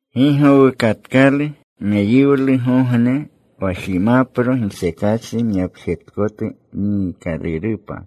Gi gowukatkalu meyiwlugogne, wa jimapro gisekachri myapjetkotu niikalurupa,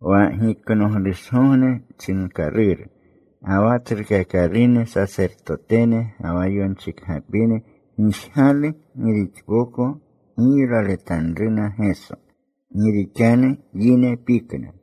wa Giknoglushgogne chinkaluru. Ga wa tsrukakalune sasertotene ga wa yonchikgapine gigjalu gi rixpoko giylaletanruna Geso, gi rixanu yine pikna.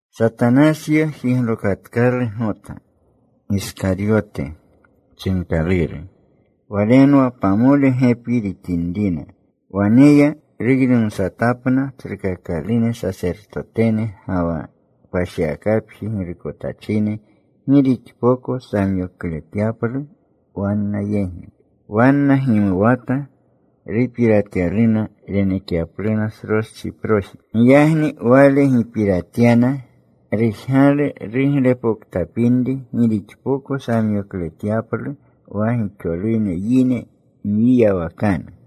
Satanasyo jiglokatkalu Gota, Giskaryote chinkaluru. Walenwa pamole gepi rixinrina. Wane ya. Ruynumsatapna tsrukakalune sasertotene ga wa kpashiwakapji girukotachine gi rixpoko samyokletyaplu wanna yegi. Wanna gimuwata. Rupiratyaluna renekyapluna sroschiproji. Giyagni wale gipiratyana. Rujgalu ruglepoktapinri gi rixpoko samyokletyaplu wa gixolune yine mwiyawakanu.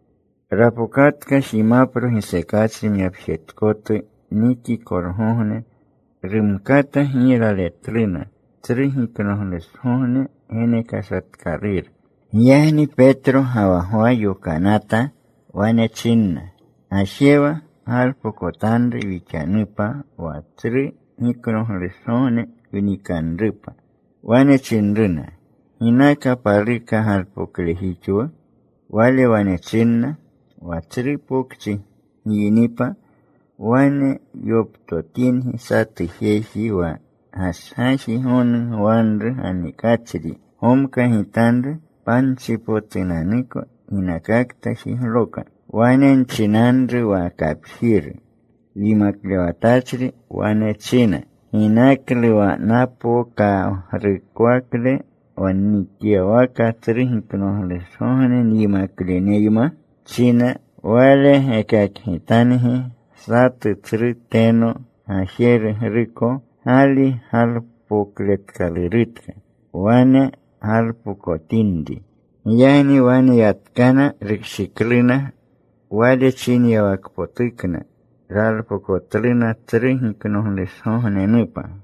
Rapokatka jimapro gisekachri myapjetkotu nikikolgogne. Rumkata giylaletluna Tsru Giknoglushgogne genekashatkaluru. Giyagni Petro ga wa Gwa yokanata. Wane chinna, “Gajewa. Galpokotanru wixanupa wa Tsru Giknoglushgogne wnikanrupa.” Wane chinruna, “¿Ginaka paluka galpoklejixwu?” Wale wane chinna, “Wa tsru pokchi gyinipa, wane yoptotingi satu jeji wa gashgaji gonu gwanru ganikachri. Gomkagitanru panchipotunanuko ginakakta jigloka. Wane nchinanru wa kapjiru, ‘Yimaklewatachri wane china, “¿Ginaklu wa napokagrukwakle wa nnikyawaka Tsru Giknoglushgogne nyimakleneyma?” china.’ “Wale gekakgitangi satu tsru teno gajerugruko gali galpokletkalurutka. Wane galpokotinri.” Giyagni wane yatkana. Rukshikluna Wale chinyawakpotukna. Ralpokotluna Tsru Giknoglushgognenupa.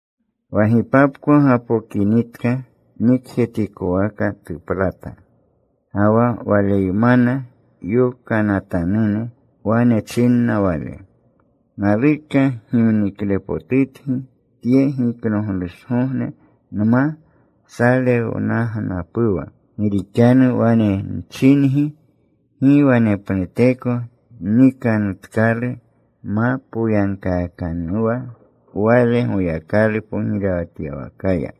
Wa gipapko gapokinitka, nikjetikwaka tuplata. Ga wa Waleymana yokanatanune. Wane chinna Wale, “Naluka gimniklepotutgi tye Giknoglushgogne nma salewnagnapuwa. Gi rixanu wane nchingi, gi wanepnuteko nnikanutkalu ma poyagkaakanuwa wale Goyakalu pogirewatyawakaya.”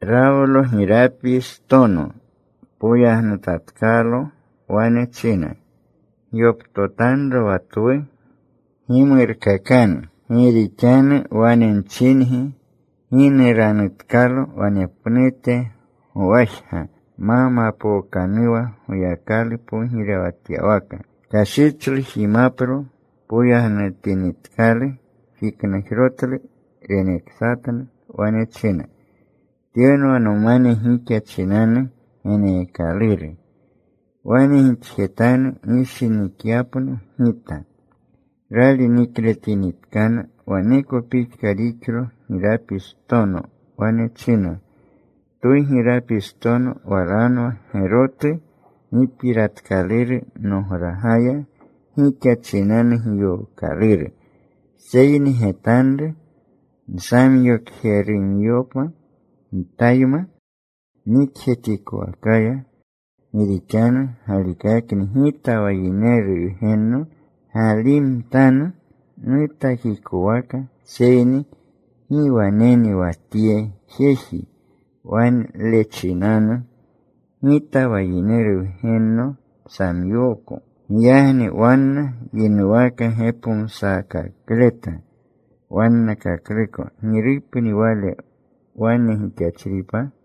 Rawlo girapistono. Poyagnutatkalo. Wane china, “Gyoptotanro wa twu. Gimurkakanu. Gi rixanu wane nchingi, gi nuranutkalo wanepnute gowajga ma mapookanuwa Goyakalu pogirewatyawaka.” Kashichlu jimapro. Poyagnutinitkalu, jiknajrotlu. Reneksatna. Wane china, “Tyenwa nomane gixa chinanu geneekaluru. Wane gixjetanu gishinikyapno Gita.” Rali nikletinitkana, waneko pixka rixlo girapistono. Wane china, “Twu girapistono walanwa gerotu gipiratkaluru nogragaya, gixa chinanu giyookaluru. “Seyni getanru nsamyokjerumyopa Gitayma nikjetikowakaya. Gi rixanu galikakni Gita wa Yineru Wgenno galimtanu nutakikowaka, seyni ¡gi waneni wa tye jeji, wale chinanu Gita wa Yineru Wgenno samyooko!” Giyagni wanna yinuwaka gepomsakakleta wannakakluko girupni wale wane gixachripa.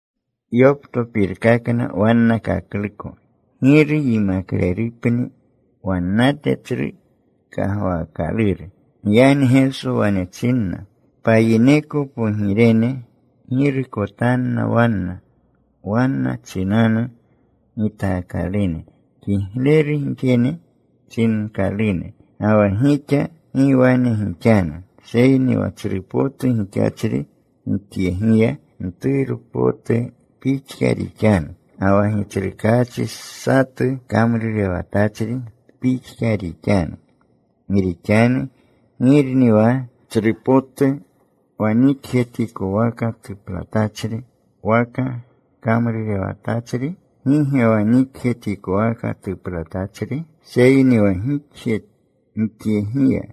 Yoptopirkakna wannakakluko giru yimaklelrupni wannate tsru kagwaakaluru. Giyagni Geso wane chinna, “Payineko pogirene girukotanna wanna, wanna chinanu gitaakalune kigleru gixjene chinkalune. Ga wa gixa gi wane gixanu. Seyni wa tsru potu gixachri gixyegiya, mturu potu pixka rixanu. Ga wa gitsrukaachi, satu kamrurewatachri pixka rixanu. Gi rixanu, ¿girni wa tsrupotu, wa nikjetikwaka tuplatachri waka kamrurewatachri? ¿Gi ge wa nikjetikwaka tuplatachri? Seyni wa gixyegiya,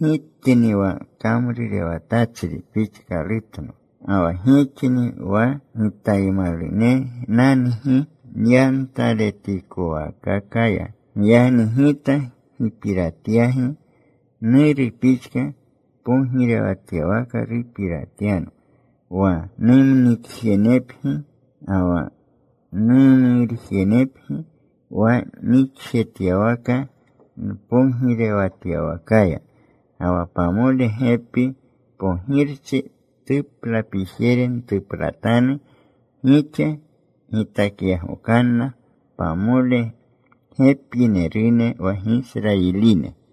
Gitni wa kamrurewatachri pixkalutno. Ga wa gixni wa Gitaymalunenangi nyantaletikowaakakaya. Giyagni Gita gipiratyagi. Nuru pixka pogirewatyawaka rupiratyano. Wa numnikjenepgi ga wa numurjenepgi wa nnikjetyawaka npogirewatyawakaya. Ga wa pamole gepi pogirchi tuplapijere ntuplatanu. Gixa gitakyagokanna pamole gepinerune wa Gisrayiline.”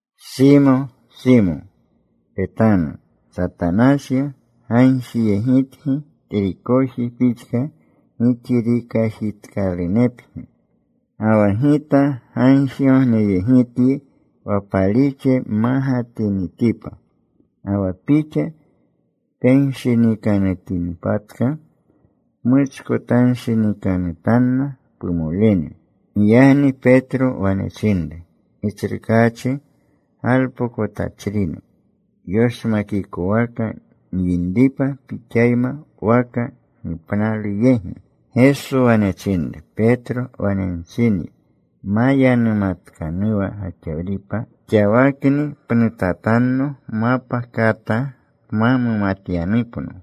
“Simo, Simo, petanu. Satanasyo gagjiyegitgi trikoji pixka gixirikajitkalunepgi. Ga wa Gita gagjigogneyegityi wa palixle mmagatinitipa. Ga wa pixa penshinikanutinpatka, pmuchkotanshinikanutanna pumolene.” Giyagni Petro wane chinru, “Gitsrukaachi, galpokotachrino yoshmakikwaka nyinripa Pixayma waka gipnalu yegi.” Geso wane chinru, “Petro, wane nchinyi, ma yanumatkanuwa gaxawripa xawakni, pnutatanno mapa kata pma mumatyanupno.”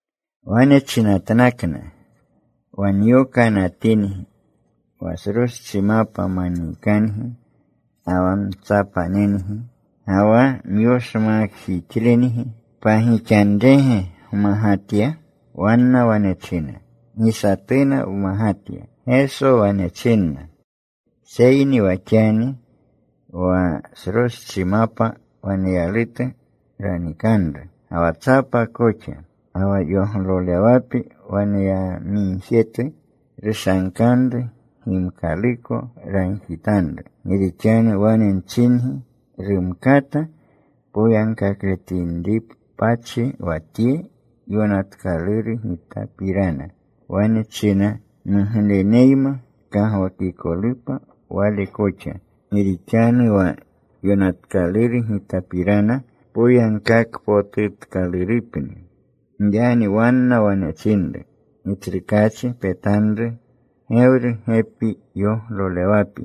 Wane chinatnakna, “Wa nyokanatingi wa sroschimapa maniikangi, ga wa mtsapanengi ga wa myoshmakjixlengi, ¿pagixanrege gmagatya?” Wanna wane china, “Gi satuna wmagatya.” Geso wane chinna, “Seyni wa xani wa sroschimapa waneyalutu ranikanru, ga wa tsapa koxa. Ga wa yoglolewapi waneyamigjetu, rushankanru gimkaluko. Ragjitanru. Gi rixanu wane nchingi rumkata poyagkakletinripachi wa tye yonatkaluru Gitapirana. Wane china: Mugleneyma kagwakikolupa Wale koxa, Gi rixanu wa yonatkaluru Gitapirana poyagkakpotutkalurupni.” Giyagni wanna wane chinru, “Gitsrukaachi, petanru. Gewru gepi yoglolewapi.”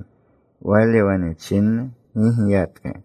Wale wane chinna, “Gigiyatka.”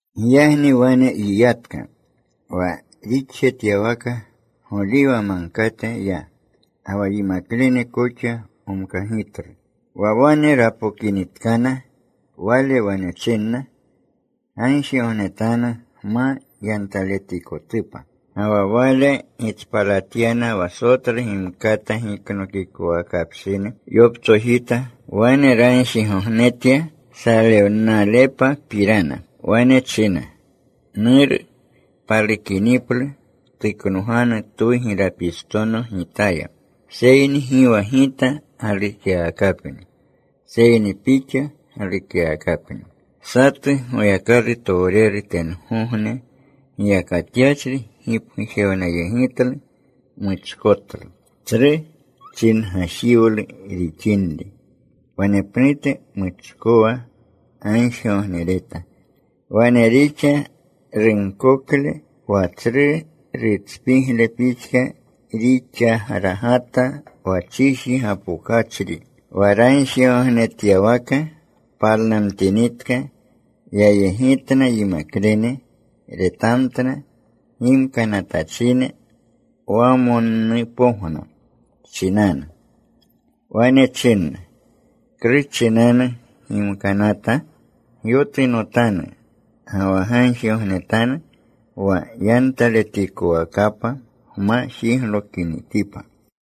Giyagni wane yiyatka. Wa rixjetyawaka Goliwa Magkate ya. Ga wa yimaklene koxa gomkagitlu. Wa wane rapokinitkana, Wale wane chinna, “Gagjigognetanu gma yantaletikotupa.” Ga wa Wale gitspalatyana wa sotlu gimkata giknokikwakapshini. Yoptsojita. Wane ragjigognetya salewnalepapirana. Wane china, “Nuru, palukiniplu tuknoganu twu girapistono Gitaya, seyni gi wa Gita galukyawakapni, seyni Pixa galukyawakapni.” Satu Goyakalutowreru tengogne giyakatyachri gipgujewnayegitlu. Muchkotlu. Tsru chingajiwlu rixinri, wanepnute muchkowa gagjigognereta. Wane rixa runkokle wa tsru rutspigle pixka rixagragata wa chiji gapokachri. Wa ragjigognetyawaka palnamtinitka. Yayegitna yimaklene. Retamtna gimkanatachine wamonnupogna chinanu. Wane chinna, “¿Klu chinanu gimkanata? Gyotunotanu. Ga wa gagjigognetanu wa yantaletikowakapa gma jiglokinitipa.”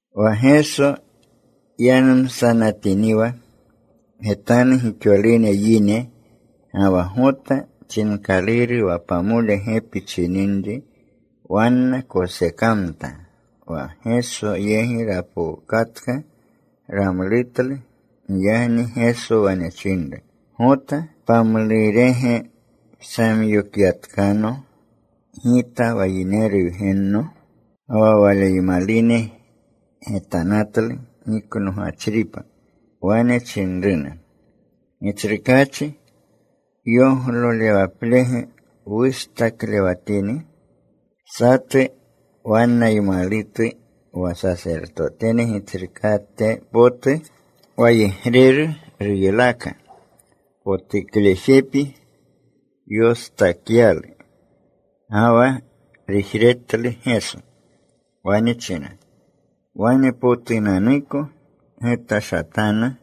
Wa Geso yanumsanatiniwa, getanu, gixolune yine. Ga wa Gota chinkaluru, wa pamole gepi chininri, wanna kosekamta. Wa Geso yegi rapokatka. Ramlutlu. Giyagni Geso wane chinru, “Gota, ¿pamlurege psamyokyatkano Gita wa Yineru Wgenno?” Ga wa Waleymalune getanatlu giknogachripa. Wane chinruna, “Gitsrukaachi, ¿yoglolewaplege wustaklewatini?” Satu wannaymalutu wa sasertotene gitsrukate potu wayegreru ruylaka. Potuklejepi yostakyalu. Ga wa rujretlu Geso. Wane china, “Wanpotunanuko getashatanu.”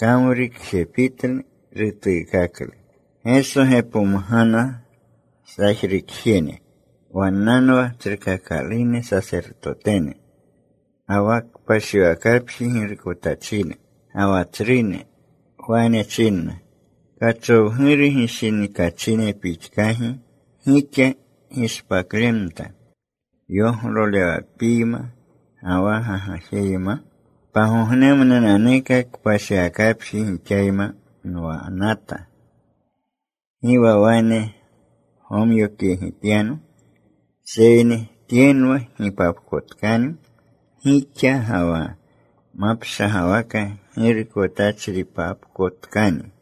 Kamrukjepitlu. Rutuukaklu. Geso gepomgana sajrukjene, wannanwa tsrukakalune sasertotene, ga wa kpashiwakapji girukotachine, ga wa tsrune; wane chinna, “¿Kachowguru gishinikachine pixkagi gixa gishpaklemta yoglolewapiyma ga wa gagajeyma? Pagognemnunanuka kpashiwakapji gixayma nwanata. Gi wa wane gomyokyegityano. Seyni tyenwa gipapkotkani gixa, ga wa mapshagwaka girukotachripapkotkani.”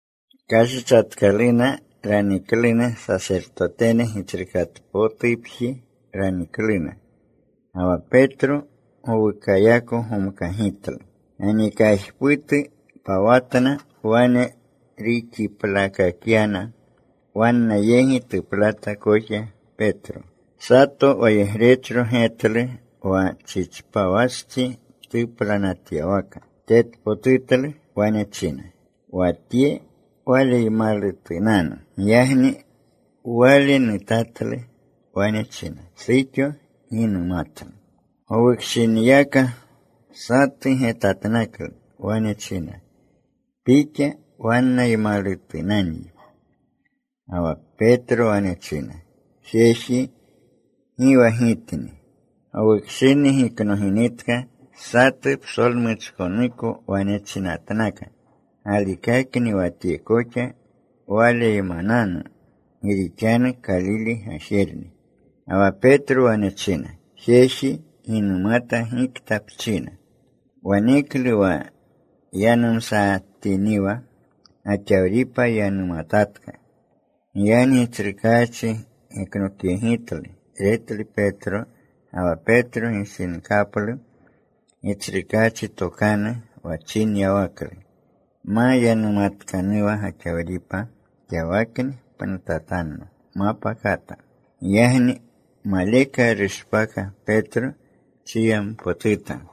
Kashichatkaluna. Ranikluna. Sasertotene gitsrukatpotupji ranikluna. Ga wa Petro gowukayako gomkagitlu. Ganikajputu pawatna. Wane ruxiplakakyana. Wanna yegi tuplata koxa Petro. Sato wayegrechro getlu wa chichpawastsi tuplanatyawaka. Tetpotutlu. Wane china, “Wa tye Waleymalutunanu.” Giyagni wale nutatlu. Wane china, “Suxo, gi numatlu.” Gowukshiniyaka satu getatnaklu. Wane china, “Pixa wannaymalutunanyi.” Ga wa Petro wane china, “Jeji, gi wa gitni.” Gowukshini giknoginitka, satu psolmuchkonuko wane chinatnaka, “Galikakni wa tye koxa Waleymananu. Gi rixanu Kalile gajerni.” Ga wa Petro wane china, “Jeji, gi numata gikta pchina.” Waneklu, wa yanumsatiniwa, gaxawripa yanumatatka. Giyagni Gitsrukaachi geknokyegitlu. Retlu Petro. Ga wa Petro gishinkaplu Gitsrukaachi tokanu, wa chinyawaklu, “Ma yanumatkanuwa gaxawripa xawakni, pnutatanno mapa kata.” Giyagni maleka rushpaka Petro. Chiyampotuta.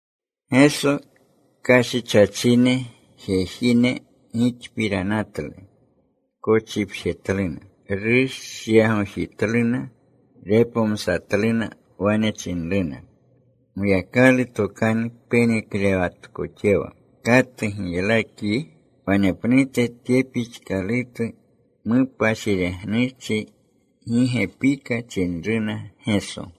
Geso kashichachine jejine gixpiranatlu. Kochipjetluna. Rushyagojitluna. Repomsatluna. Wane chinruna, “Goyakalu tokanu peneklewatkoxewa. ¿Katu giylakyi?” Wanepnute tye pixkalutu mupashiregnuchi gi gepika chinruna Geso.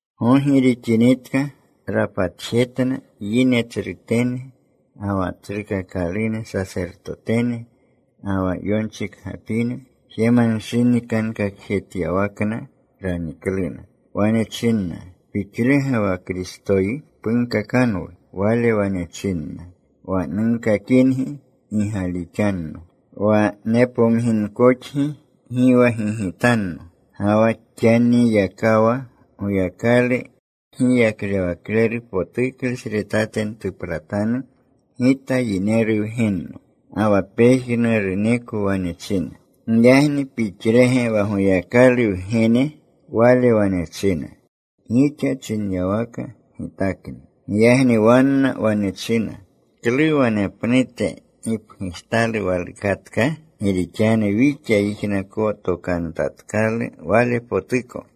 Gogi rixinitka rapatjetna yine tsrutene, ga wa tsrukakalune sasertotene, ga wa yonchikgapine. Jemanshinikankakjetyawakna ranikluna. Wane chinna, “¿Pixlege wa Kristoyi? Punkakanwu.” Wale wane chinna, “Wa nunkakingi gi galixanno. Wa nepomginkoxgi, gi wa gigitanno. Ga wa xaniyakawa Goyakalu kgiyaklewakleru potuklesretate ntuplatanu Gita Yineru Wgenno.” Ga wa pejnuruneko wane china, “Giyagni ¿Pixlege wa Goyakalu Wgene?” Wale wane china, “Gixa chinyawaka Gitakni.” Giyagni wanna wane china, “¿Klu wanepnute gipgujtalu walukatka? Gi rixanu wixa yijnakotokanutatkalu Walepotuko.”